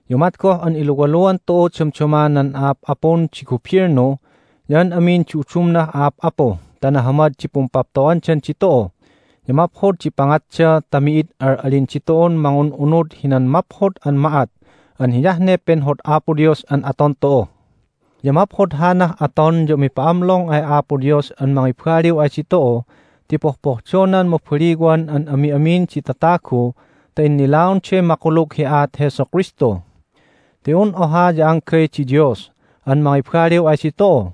Ya umat goh an iluwaluan tu'u damdama nan a'ap'apun di gubilnu ya an amin di udumnah a'ap'apu ta nahamad di pumpapto'dan ditu'u ya maphod di pangatda ta mi'id al'alin ditu'un mangun'unud hinan maphod an ma'at an hiyah ne penhod Apo Dios an aton tu'u. Ya maphod hanah aton ya umipa'amlong ay Apo Dios an mangibaliw ay ditu'u ti pohpohdonan mabaliwan an ami'amin di tatagu ta innilaonday makulug hi aat Jesu Kristu. Ti un oha ya anggay di Dios an mangibaliw ay ditu'u,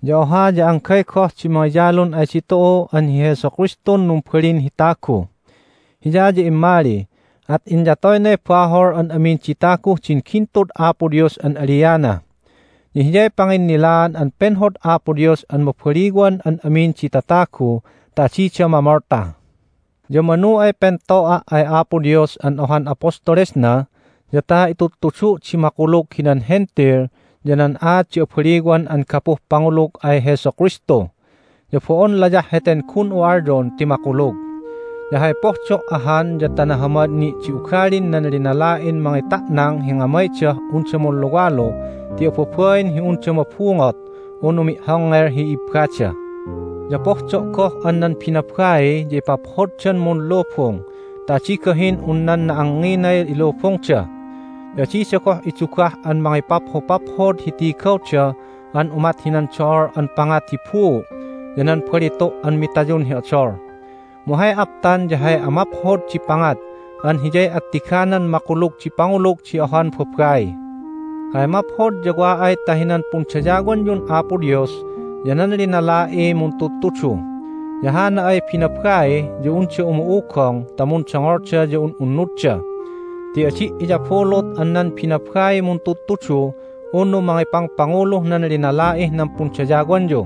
ya oha ya anggay goh di mangiyalun ay ditu'u an hi Jesu Kristun numbalin hi tagu. Hiya ya immali, at inyatoynay bahol an amin di taguh din gintud Apo Dios an aliana. Ya Hiyay panginnilaan an penhod Apo Dios an mabaliwan an amin di tatagu ta adida mamolta. Ya manu ay pento'a' ay Apo Dios an ohan apostolesna ya ta itudtudu' di makulug hinan Hentil ya nan aat di abaliwan an gapuh pangulug ay Jesu Kristu. Ya bo'on layah heten gun'u alyon ti makulug. Ya hay pohdo' ahan ya ta nahamad ni' di ugalin nan linala'in mangita'nang hi ngamaydah unda munluwalu ti ababain hi unda mabungot unu mi'hongngel hi ibbada. Ya pohdo' goh an nan binabai ya ipaphoddan munlubung ta adi gahin un nan na'angnginay ilubungda, ya adida goh idugah an mangipaphopaphod hi tigawda an umat hinan do'ol an pangat hi buu' ya nan balitu' an mitayun hi odol, mu hay aptan ya hay amaphod di pangat an hiyay attiganan makulug di pangulug di ohan babai. Hay maphod ya wa ay ta hinan pundayawanyun Apo Dios ya nan linala'iy muntudtudu, ya hana ay binabai ya unda umu'ugong ta mundongolda ya un'unnudda. Ti adi' iyabulut an nan binabaiy muntudtudu unu mangipangpanguluh nan linala'ih nan pundayawanyu,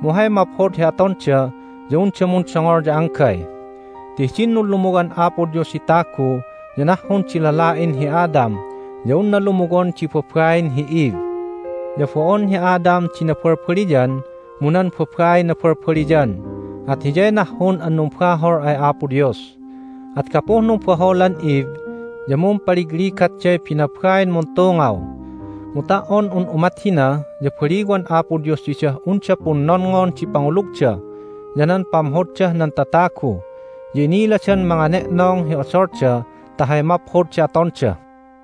mu hay maphod hi atonda ya unda mundongol ya anggay. Ti hidin nunlumuwan Apo Dios hi tagu ya nahhun di lala'in hi Adam ya unna lumuwon di babain hi Eve. Ya bo'on hi Adam di nabalbaliyan, mu nan babaiy nabalbaliyan, at hiyay nahhun an numbahol ay Apo Dios. At gapuh numbaholan Eve ya mumpaligligatday binabain muntungaw. Mu ta"on un umat hina ya baliwan Apo Dios didah unda punnonngon di pangulugda, ya nan pamhoddah nan tatagu, ya iniladan mangane'nong hi odolda ta hay maphod di atonda.